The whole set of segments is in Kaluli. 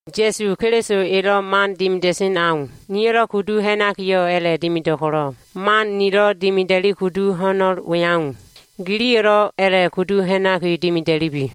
Ya꞉su Keliso elo꞉ man dimida꞉sen au, niyo꞉lo꞉ kudu ha꞉nakiyo꞉ a꞉la꞉dimido꞉ ko꞉lo꞉, man nilo꞉ dimida꞉li kudu ho꞉no꞉l we au, giliyo꞉lo꞉ a꞉la꞉kudu ha꞉naki dimida꞉lubi.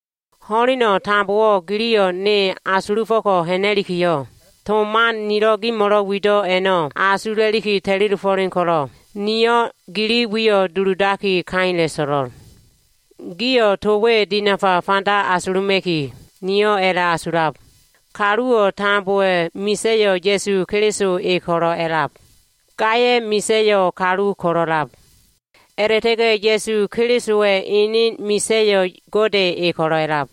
Ho꞉leno꞉ tambowo꞉ giliyo꞉ ne asulufo꞉ko꞉ ha꞉na꞉likiyo꞉, to man nilo꞉ gimo꞉lo꞉ wido꞉ a꞉no꞉ asula꞉liki ta꞉li dofo꞉len ko꞉lo꞉, niyo꞉ gili wiyo꞉ duludaki, kaila꞉ so꞉lo꞉l. Gio꞉ to we dinafa fanda asuluma꞉ki niyo꞉ a꞉la꞉asulab. Kaluwo꞉ tambowa꞉ misa꞉yo꞉ Ya꞉su Keliso e ko꞉lo꞉ a꞉lab. Gaya꞉ misa꞉yo꞉ kalu ko꞉lo꞉lab. A꞉la꞉ta꞉ga꞉ Ya꞉su Kelisowa꞉ enen misa꞉yo꞉ Gode e ko꞉lo꞉lab.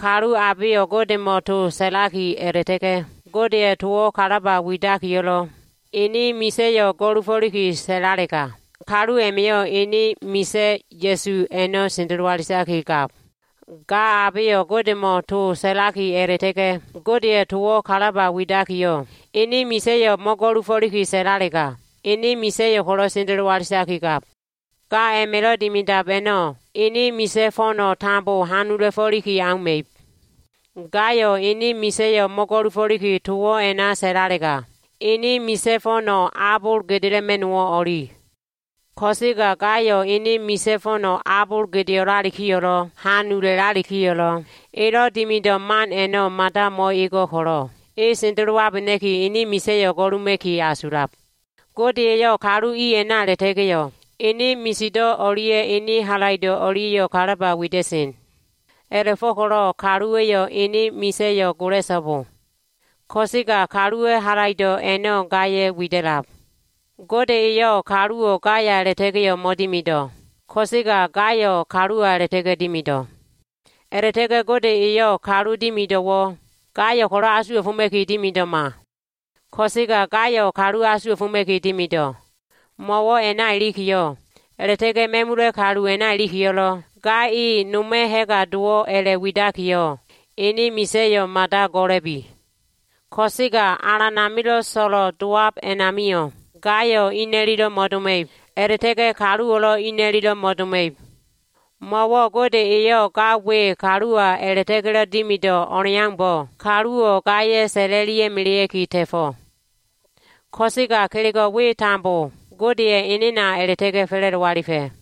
Kalu abeyo꞉ Godemo꞉ to sa꞉laki, a꞉la꞉ta꞉ga꞉ Godeya꞉ towo꞉ kalaba widakiyo꞉lo꞉, ene misa꞉yo꞉ go꞉lufo꞉liki sa꞉lalega, kalu a꞉ma꞉yo꞉ ene misa꞉ Ya꞉su a꞉no꞉ sendelo alitakigab. Ga abeyo꞉ Godemo꞉ to sa꞉laki, a꞉la꞉ta꞉ga꞉ Godeya꞉ towo꞉ kalaba widakiyo꞉, ene misa꞉yo꞉ mo꞉go꞉lufo꞉liki sa꞉lalega, ene misa꞉yo꞉ ko꞉lo꞉ sendelo alitakigab. Ga a꞉ma꞉lo꞉ dimidab a꞉no꞉, ene misa꞉ fo꞉no꞉ tambo hanula꞉fo꞉liki auma꞉ib. Gayo꞉ ene misa꞉yo꞉ mo꞉go꞉lufo꞉liki towo꞉ a꞉na sa꞉lalega, ene misa꞉ fo꞉no꞉ abol gedela꞉ma꞉no꞉wo꞉ o꞉li. Ko꞉sega gayo꞉ ene misa꞉ fo꞉no꞉ abol gedeo꞉lalikiyo꞉lo꞉, hanula꞉lalikiyo꞉lo꞉, elo꞉ dimido꞉ man a꞉no꞉ mada mo꞉ego꞉ ko꞉lo꞉, e sendelowabena꞉ki, ene misa꞉yo꞉ go꞉luma꞉ki asulab. Gode eyo꞉ kalu i a꞉na a꞉la꞉ta꞉ga꞉yo꞉, ene misido꞉ o꞉lia꞉ ene halaido꞉ o꞉lia꞉yo꞉ kalaba wida꞉sen. A꞉la꞉fo꞉ko꞉lo꞉ kaluwa꞉yo꞉ ene misa꞉yo꞉ go꞉la꞉so꞉bo. Ko꞉sega kaluwa꞉ halaido꞉ a꞉no꞉ gaya꞉ wida꞉lab. Gode eyo꞉ kaluwo꞉ gaya a꞉la꞉ta꞉ga꞉yo꞉ mo꞉dimido꞉, ko꞉sega gayo꞉ kaluwa a꞉la꞉ta꞉ga꞉ dimido꞉. A꞉la꞉ta꞉ga꞉ Gode eyo꞉ kalu dimido꞉wo꞉, gayo꞉ ko꞉lo꞉ asuwa꞉foma꞉ki dimido꞉ma. Ko꞉sega gayo꞉ kalu asuwa꞉foma꞉ki dimido꞉. Mo꞉wo꞉ a꞉na ilikiyo꞉, a꞉la꞉ta꞉ga꞉ ma꞉mula꞉ kalu a꞉na ilikiyo꞉lo꞉, ga e noma꞉ ha꞉ga dowo꞉ a꞉la꞉widakiyo꞉, ene misa꞉yo꞉ mada go꞉la꞉bi. Ko꞉sega Alan amilo꞉ so꞉lo꞉ dowab a꞉namio꞉, gayo꞉ ina꞉lilo꞉ mo꞉doma꞉ib, a꞉la꞉ta꞉ga꞉ kaluwo꞉lo꞉ ina꞉liyo꞉ mo꞉doma꞉ib. Mo꞉wo꞉ Gode eyo꞉ ga we kaluwa a꞉la꞉ta꞉ga꞉lo꞉ dimido꞉ o꞉leaumbo꞉, kaluwo꞉ gaya꞉ sa꞉la꞉lia꞉ melea꞉ki ta꞉fo꞉. Ko꞉sega kelego꞉ we tambo Godeya꞉ enena a꞉la꞉ta꞉ga꞉ fa꞉la꞉do alifa꞉.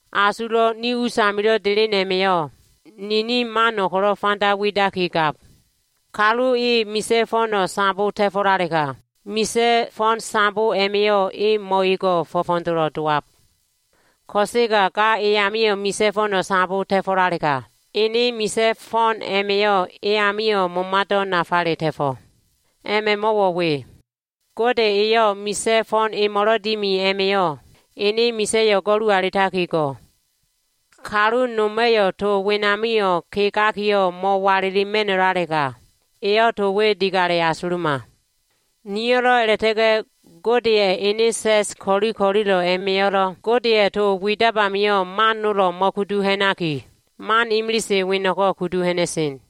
Asulo꞉ ni us amilo꞉ delen a꞉ma꞉yo꞉ ninin mano꞉ ko꞉lo꞉ fanda widakigab. Kalu e misa꞉ fo꞉no꞉ sambo ta꞉fo꞉lalega, misa꞉ fo꞉n sambo a꞉ma꞉yo꞉ e mo꞉ego꞉, fo꞉fo꞉dolo꞉ dowab. Ko꞉sega ga eyamio꞉ misa꞉ fo꞉no꞉ sambo ta꞉fo꞉lalega, ene misa꞉ fo꞉n a꞉ma꞉yo꞉ e amio꞉ momado꞉ nafale ta꞉fo꞉. A꞉ma꞉ mo꞉wo꞉ we. Gode eyo꞉ misa꞉ fo꞉n emo꞉lo꞉ dimi a꞉ma꞉yo꞉, ene misa꞉yo꞉ go꞉lu alitaki go꞉. Kalu noma꞉yo꞉ to wenamio꞉ kegakiyo꞉ mo꞉walilima꞉no꞉lalega, eyo꞉ to we digale asuluma. Niyo꞉lo꞉ a꞉la꞉ta꞉ga꞉ Godeya꞉ ene sa꞉s ko꞉li ko꞉lilo꞉ a꞉ma꞉yo꞉lo꞉, Godeya꞉ to widab amio꞉ man nolo꞉ mo꞉kudu ha꞉naki, man imilise weno꞉ko꞉ kudu ha꞉na꞉sen.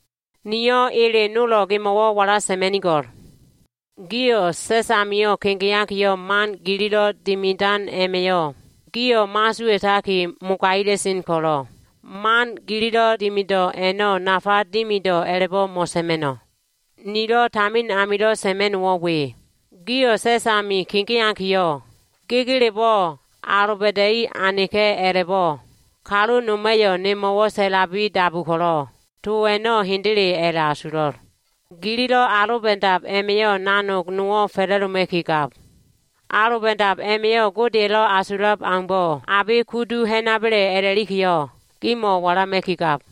Niyo꞉ ele nolo꞉ gimo꞉wo꞉ wala sa꞉ma꞉nigo꞉l. Gio꞉ sa꞉s amio꞉ kegeakiyo꞉, man gililo꞉ dimidan a꞉ma꞉yo꞉, gio꞉ mo꞉asuwa꞉taki mogaila꞉sen ko꞉lo꞉, man gililo꞉ dimido꞉ a꞉no꞉ nafa dimido꞉ a꞉la꞉bo꞉ mo꞉sa꞉ma꞉no꞉. Nilo꞉ tamin amilo꞉ sa꞉ma꞉no꞉wo꞉ we. Gio꞉ sa꞉s ami kegeakiyo꞉, gegelebo꞉ aloba꞉da꞉i aneka꞉ a꞉la꞉bo꞉ kalu noma꞉yo꞉ nemo꞉wo꞉ sa꞉labi dabu ko꞉lo꞉, to a꞉no꞉ hendele a꞉la꞉asulo꞉l. Gililo꞉ aloba꞉dab a꞉ma꞉yo꞉, nanog nowo꞉ fa꞉la꞉doma꞉ki gab. Aloba꞉dab a꞉ma꞉yo꞉ Godeya꞉lo꞉ asulab aumbo꞉ abe kudu ha꞉naba꞉le a꞉la꞉likiyo꞉, gimo꞉ walama꞉ki gab.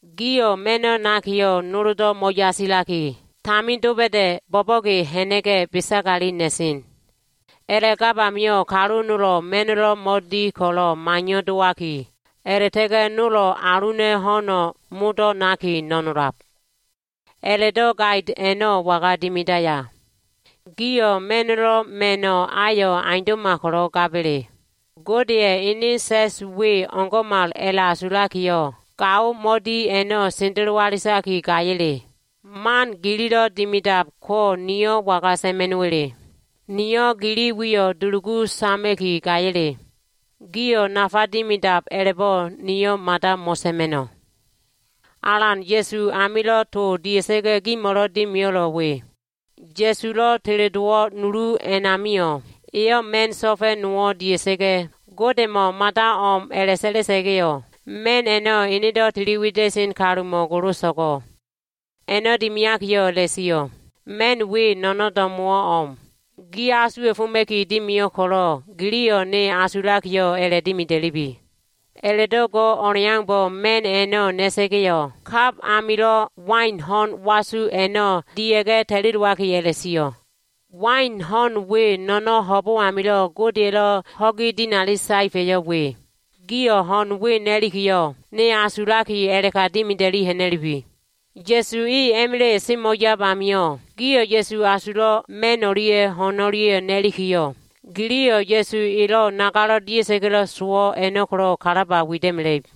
Gio꞉ ma꞉no꞉ nakiyo꞉, noldo꞉ mo꞉yasilaki, tamin doba꞉da꞉ bo꞉bo꞉ge ha꞉na꞉ga꞉ besagali na꞉sen. A꞉la꞉gab amio꞉, kalu nolo꞉ ma꞉no꞉lo꞉ mo꞉di ko꞉lo꞉ maiyo꞉ dowaki, a꞉la꞉ta꞉ga꞉ nolo꞉ aluna꞉ ho꞉no꞉ modo꞉ naki no꞉nolab. A꞉la꞉do꞉ gait a꞉no꞉ waga dimidaya? Gio꞉ ma꞉no꞉lo꞉ ma꞉no꞉ ayo꞉ aundo꞉ma ko꞉lo꞉ gaba꞉le? Godeya꞉ ene sa꞉s we o꞉ngo꞉mal a꞉la꞉asulakiyo꞉, gao mo꞉di a꞉no꞉ sendelo alitaki gaya꞉le? Man gililo꞉ dimidab ko niyo꞉ waga sa꞉ma꞉no꞉wa꞉le? Niyo꞉ gili wiyo꞉ dulugu sama꞉ki gaya꞉le? Gio꞉ nafa dimidab a꞉labo꞉, niyo꞉ mada mo꞉sa꞉ma꞉no꞉. Alan Ya꞉su amilo꞉ to dia꞉sa꞉ga꞉ gimo꞉lo꞉ dimio꞉lo꞉ we. Ya꞉sulo꞉ teledowo꞉ nulu a꞉namio꞉ eyo꞉ ma꞉n so꞉fa꞉ nowo꞉ dia꞉sa꞉ga꞉, Godemo꞉ mada o꞉m a꞉la꞉sa꞉la꞉sa꞉ga꞉yo꞉, ma꞉n a꞉no꞉ enedo꞉ tili wida꞉sen kalumo꞉ goloso꞉go꞉. A꞉no꞉ dimiakiyo꞉ a꞉la꞉sio꞉, “Ma꞉n we no꞉no꞉n do꞉mo꞉wo꞉ o꞉m. Gi asuwa꞉foma꞉ki dimio꞉l ko꞉lo꞉, giliyo꞉ ne asulakiyo꞉, a꞉la꞉dimida꞉lubi.” A꞉la꞉do꞉ go꞉ o꞉leaumbo꞉, ma꞉n a꞉no꞉ na꞉sa꞉ga꞉yo꞉, kab amilo꞉ wain ho꞉n wasu a꞉no꞉ dia꞉ga꞉ ta꞉li dowaki a꞉la꞉sio꞉, “Wain ho꞉n we no꞉no꞉n ho꞉bo꞉ amilo꞉ Godeya꞉lo꞉ ho꞉gi dinali saefa꞉yo꞉ we. Gio꞉ ho꞉n we na꞉likiyo꞉, ne asulaki, a꞉la꞉ka dimida꞉li ha꞉na꞉lubi.” Ya꞉su e a꞉ma꞉la꞉yo꞉ semo꞉ yab amio꞉, gio꞉ Ya꞉su asulo꞉ ma꞉n o꞉lia꞉ ho꞉n o꞉lia꞉ na꞉likiyo꞉, giliyo꞉ Ya꞉su elo꞉ nagalo꞉ dia꞉sa꞉ga꞉lo꞉ sowo꞉ a꞉no꞉ ko꞉lo꞉ kalaba wida꞉mela꞉ib.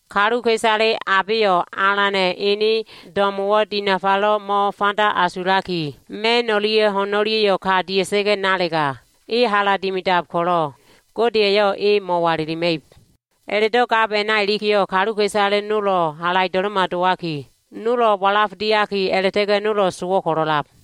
Kaluka꞉isale abeyo꞉ Alana꞉ ene do꞉mo꞉wo꞉ dinafalo꞉ mo꞉fanda asulaki, ma꞉n o꞉lia꞉ ho꞉n o꞉lia꞉yo꞉ ka dia꞉sa꞉ga꞉ nalega, e hala dimidab ko꞉lo꞉, Gode eyo꞉ e mo꞉walilima꞉ib. A꞉la꞉do꞉ gab a꞉na ilikiyo꞉, kaluka꞉isale modo꞉wo꞉ halaido꞉lo꞉ma dowaki, nolo꞉ walaf diaki, a꞉la꞉ta꞉ga꞉ nolo꞉ sowo꞉ ko꞉lo꞉lab.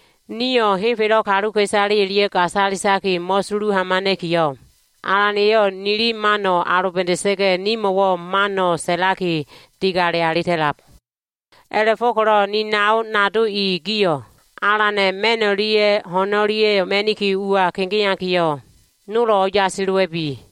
Nio꞉ henfelo꞉ kaluka꞉isale o꞉lia꞉ gasalitaki mo꞉sulu hamana꞉kiyo꞉, Alan eyo꞉ nili mano꞉ aloba꞉da꞉sa꞉ga꞉, nimo꞉wo꞉ man sa꞉laki, digale alita꞉lab. A꞉la꞉fo꞉ko꞉lo꞉ ni nao nado i, gio꞉ Alana꞉ ma꞉n o꞉lia꞉ ho꞉n o꞉lia꞉ ma꞉niki ua kegeakiyo꞉, nolo꞉ o꞉yasi dowa꞉bi.